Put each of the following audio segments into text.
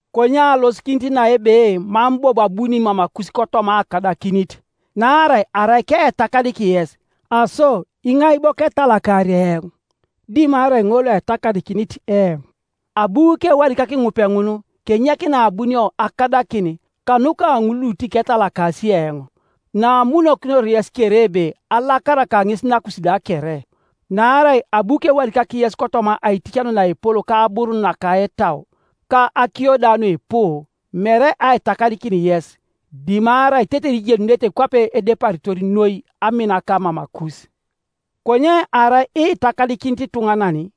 Konye alosikinit na ebe mam bobo abuni mamakus kotoma akadakinit. Naarai arai keetakadik yes, aso iŋai bo ketalakari eoŋ, dimarai ŋol loetakadikinit eoŋ? Abu kewadikak ŋupeŋun kenyek naabunio akadakin kanuka ŋul lutiketalakasi eoŋ, naamunokinor yes kere ebe alakaraka ŋes nakus da kere. Naarai abu kewadikak yes kotoma aiticanio naepol ka aburun naka etau, ka akiyo da nuipu, mere aitakadikin yes, dimarai tetere ijenunete kwape edeparitor noi aminaka mamakus. Konye arai itakadikinit ituŋanan,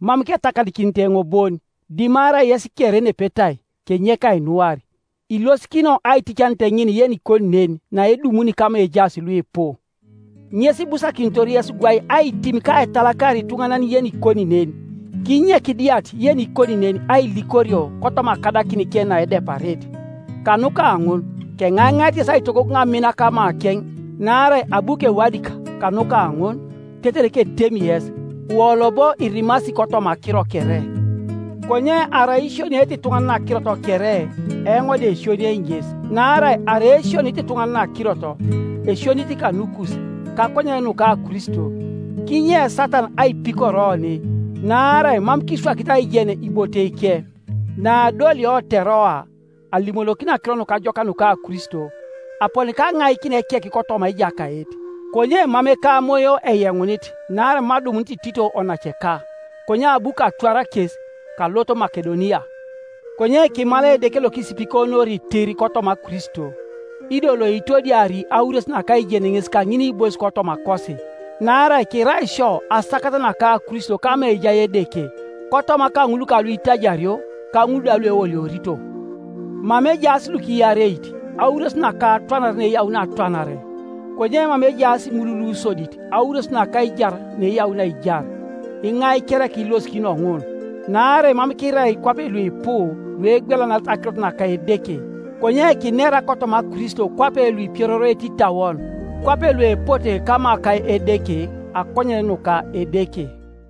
mam ketakadikinit eoŋ bon, dimarai yes kere nepetai, kenyek ainuar. Ilosikino aiticanet ŋin yenikoni nen naedumuni kama ejaas luipu; ŋes ibusakinitor yes gwai aitim ka aitalakar ituŋanan yenikoni nen, kinyek diat yenikoni nen ailikorio kotoma akadakinike naedeparit. Kanuka ŋun keŋaiŋait yes aitogogoŋ amin kamakeŋ. Naarai abu kewadik kanuka ŋun, tetere ketemi yes, wolo bo irimasi kotoma akiro kere. Konye arai isioniete ituŋanan akirot kere, eoŋ da esioniei ŋes. Naarai arai esionit ituŋanan akirot, esionit kanukus, kakonyen nuka Kristo, kinye Satan aipikor oni; naarai mam kiswakit aijen iboteike. Naadolio Teroa alimonokin Akiro Nukajokak nuka Kristo, aponi kaŋaikin ekek kotoma Ejakait; konye mam ekamoyo eyeŋunit naarai mam adumunit Tito onaceka. Konye abu katwar kes, kalot Makedonia. Konye kimalai Edeke lokisipikonori tir kotoma Kristo, ido loitodiari aures naka aijen ŋes kaŋiniibois kotomakosi. Naarai kirai isio asakat naka Kristo kama ejai Edeke, kotoma kaŋul kaluitaiario, kaŋul da lueoliorito, mama ejaas lukiareit, aures naka atwanare naeyauni atwanare, konye mama ejaas ŋul lusodit aures naka aijar naeyauni aijar. Iŋai kereka ilosikino ŋun? Naarai mam kirai kwape luipu luegwelanarete akirot naka Edeke, konye kinera kotoma Kristo kwape luipiororoete itauon, kwape luepote kama ka Edeke, akonyen nuka Edeke.